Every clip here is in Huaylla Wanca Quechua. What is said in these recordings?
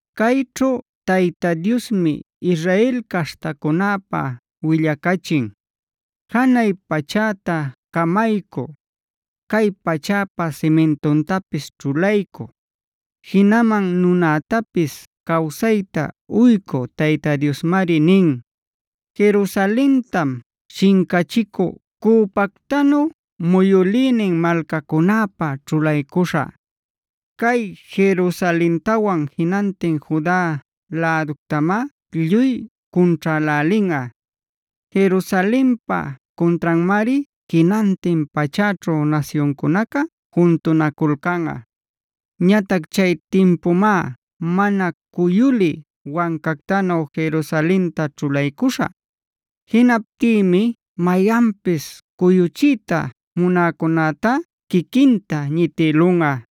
Cayćhu Tayta Diosmi Israel caśhtacunäpä willacachin. Janay pachäta camaycü, cay pachäpa simintuntapis ćhulaycü, jinaman nunätapis cawsayta uycü Tayta Diosmari nin: “Jerusalentam shincachicü cüpactanu muyülïnin malcacunäpä ćhulaycuśhä. Cay Jerusalentawan jinantin Juda läductamá lluy cunćhälälinꞌa. Jerusalenpa cuntranmari jinantin pachäćhu nasyuncunaca juntunaculcanꞌa. Ñatac chay timpumá mana cuyulï wancactanu Jerusalenta ćhulaycuśhä. Jinaptïmi mayanpis cuyuchiyta munäcunätá quiquinta ñitïlunꞌa.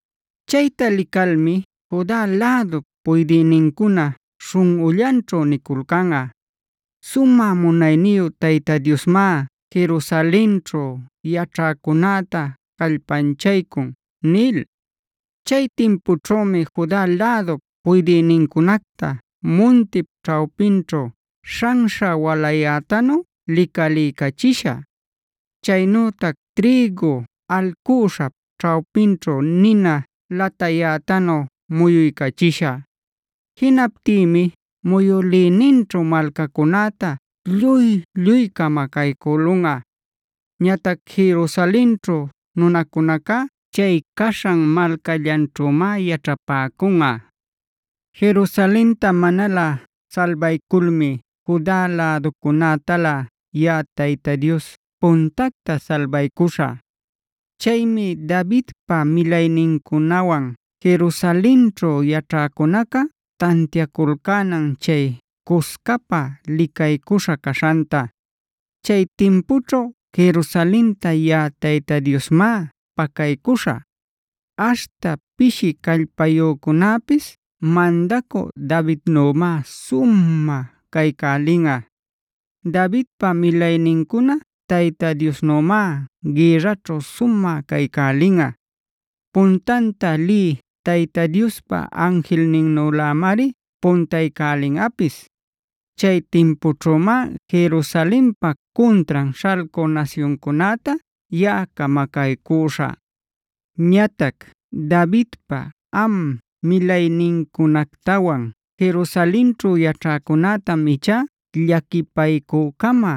Chayta licalmi Juda lädup puydïnincuna śhunꞌullanćhu niculcanꞌa: ‘Sumä munayniyu Tayta Diosmá Jerusalenćhu yaćhäcunäta callpanchaycun’ nil. Chay timpućhümi Juda lädup puydïnincunacta muntip ćhawpinćhu śhanśha walayätanu licaliycachishä; chaynütac trïgu alcüśhap ćhawpinćhu nina latayätanu muyuycachishä. Jinaptïmi muyülïninćhu malcacunäta lluy-lluy camacaycülunꞌa. Ñatac Jerusalenćhu nunacunacá chay caśhan malcallanćhümá yaćhapäcunꞌa. “Jerusalenta manalä salbayculmi Juda läducunätalä yaꞌa Tayta Dios puntacta salbaycuśhä. Chaymi Davidpa milaynincunawan Jerusalenćhu yaćhäcunaca tantiaculcänan chay cuscapa licaycuśha caśhanta. Chay timpućhu Jerusalenta yaꞌa Tayta Diosmá pacaycuśhä. Aśhta pishi callpayücunäpis mandacü Davidnümá sumä caycälinꞌa. Davidpa milaynincuna Tayta Diosnümá gïrraćhu sumä caycälinꞌa; puntanta lï Tayta Diospa anjilninnülämari puntaycälinꞌapis. Chay timpućhümá Jerusalenpa cuntran śhalcü nasyuncunäta yaꞌa camacaycüśhä. “Ñatac Davidpa am milaynincunactawan Jerusalenćhu yaćhäcunätam ichá llaquipaycü-cama,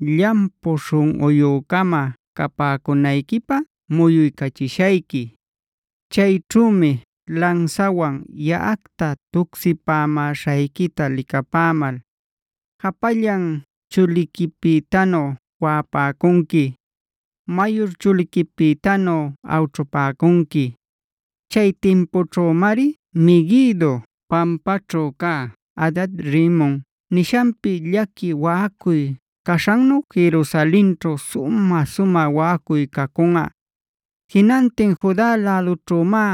llampu śhunꞌuyü-cama capäcunayquipä muyuycachishayqui. Chayćhümi lansawan yaꞌacta tucsipämäśhayquita licapämal, japallan chuliquipïtanu waꞌapäcunqui, mayur chuliquipïtanu awćhupäcunqui. Chay timpućhümari Meguido pampaćhu cä Hadad-rimon nishanpi llaqui waꞌacuy caśhannu Jerusalenćhu sumä-sumä waꞌacuy cacunꞌa. Jinantin Juda lädućhümá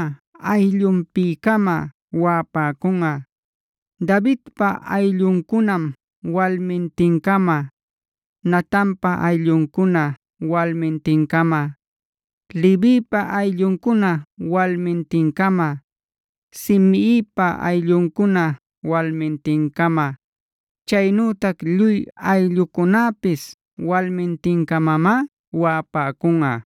ayllunpi-cama waꞌapäcunꞌa: Davidpa aylluncunam walmintin-cama, Natanpa aylluncuna walmintin-cama, Levipa aylluncuna walmintin-cama, Simeipa aylluncuna walmintin-cama, chaynütac lluy ayllucunäpis walmintin-camamá waꞌapäcunꞌa.